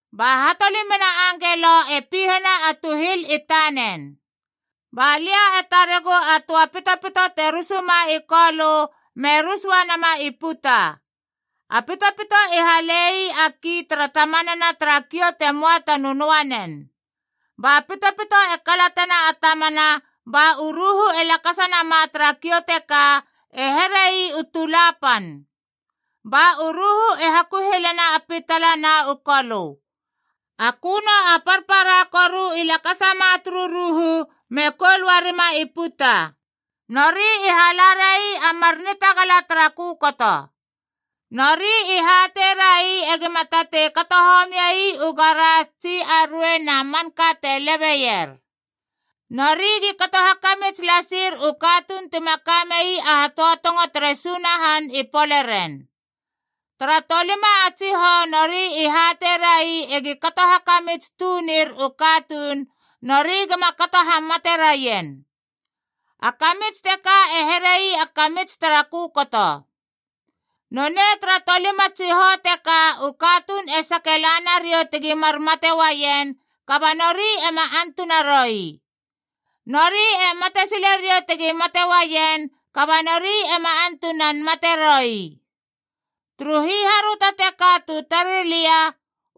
Ba hatolimana angelo e pihena a tuhil i tanen. Ba lia e taregu a töa pitopito te rusuma i kolö me rus uanama i puta. A pitopito i hale ii a kii tara tamanana tara kiou te möa ta nönöanen. Ba pitopito e kalatena a tamana ba u ruhu e lakasa nama tara kiou teka e here ii u tula pan. Ba u ruhu e hakuhilena a pitala na u kolö. A köno a parpara koru i lakasama turu ruhu me koul uarima i puta. Nori i hala rai a mar nitagala tara kökoto. Nori i hateirai egima tatei kato homiei u garas tsi a ruei na manka te lebeier. Nori gi kato hakamits lasir u katuun tima ka mei a hatöatongo tere Sunahan i poleren. Tara tolima a tsihou nori i hateirai egi kato hakamits tunir u katuun, nori gima kato hamate raien. A kamits teka e here ii a kamits tara kökoto. Nonei tara tolima a tsihou teka u katuun e sake la nariou tegi mar mate uaien, kaba nori ema antuna roi. Nori e matesile riou tegi mate uaien, kaba nori ema antunan mate roi. Turu hiharöto teka tu tarei lia,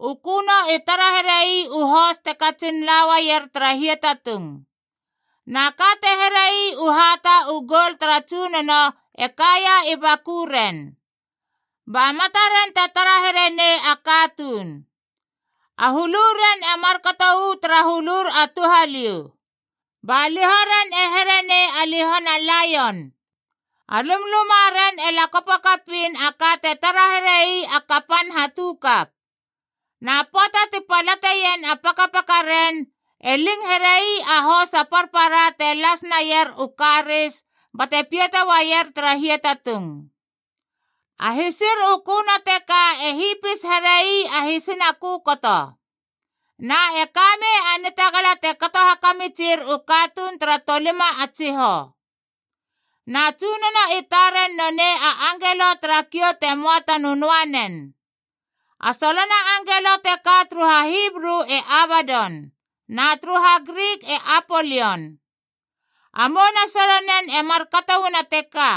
u köno i tara here ii u hos te katsin la uaier tara hiatatung. Na ka te here ii u hata u goul tara tsunono e kaia i bakuren. Ba mataren te tara here nei a katuun. A huluren e markato uu tara hulur a touhaliou, ba lihoren e here nei a lihona laion. A lumlumaren e lakopo kapiin a ka te tara here ii a kapan hatukap. Na pöata ti palateien a pakapakaren, e ling here ii a hos a parpara te las naier u karis bate piata uaier tara hiatatung. A hisir u köno teka e hipis here ii a hisina kökoto. Na e ka mei a nitagala te kato hakamitsir u katuun tara tolima a tsihou. Na tsunono i taren nonei a angelo tara kiou te möa ta nönöanen. A solona angelo teka turu HaHibru e Abadon, na turu HaGrik e Apolion. A mouna solonen e markato uana teka,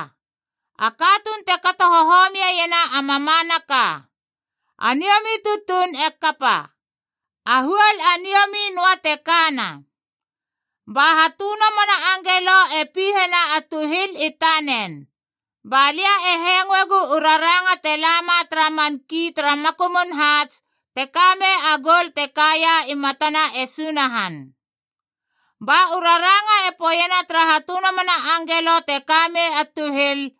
A katuun te kato hohomiena a mamanaka. A niomi tutuun e kapa. A huol a niomi noa te kana. Ba hatönomona angelo e pihena a tuhil i tanen. Ba lia e hengoegu u raranga te lama tara man kia tara makumun haats te ka mei a goul te kaia i matana e Sunahan. Ba u raranga e poeiena tara hatönomona angelo te ka mei a tuhil,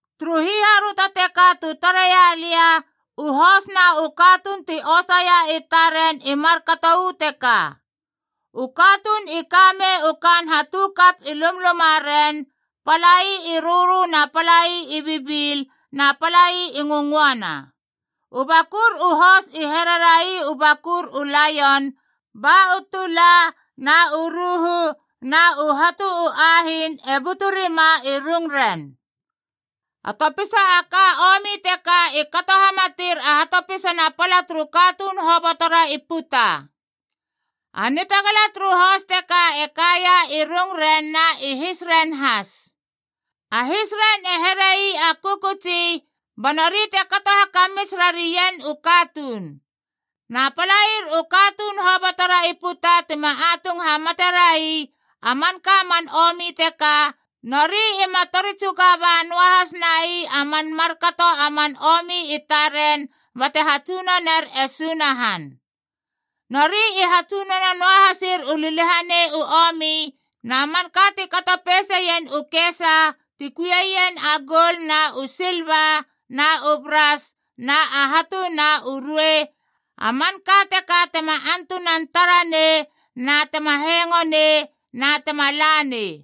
Turu hiharöto teka tu tareia lia, u hos na u katuun ti osaia i taren i markato uu teka: U katuun i ka mei u kaan hatukap i lumlumaren, palai i rörö na palai i bibil na palai u ngöngöana. U bakur u hos i here rai u bakur u laion, ba u tula na u ruhu na u hatu u ahiin e butu rima i rungren. A topisa ka a omi teka i kato hamateir a hatopisana a pala turu katuun hobotora i puta. A nitagala turu hos teka e kaia i rungren na i hisren has. A hisren e here ii a kökötsi, ba nori te kato hakamits rarien u katuun. Na palair u katuun hobotora i puta tima atung hamate rai a manka a man omi teka, nori ima tori tsuga ba noa has nai a man markato a man omi i taren bate hatsunoner e Sunahan. Nori i hatsunono noa hasir u liliahanei u omi na manka ti kato peiseien u kesa ti kuieien a goul na u silva na u bras na a hatu na u ruei, a manka teka tema antunan tara nei na tema hengo nei na tema la nei.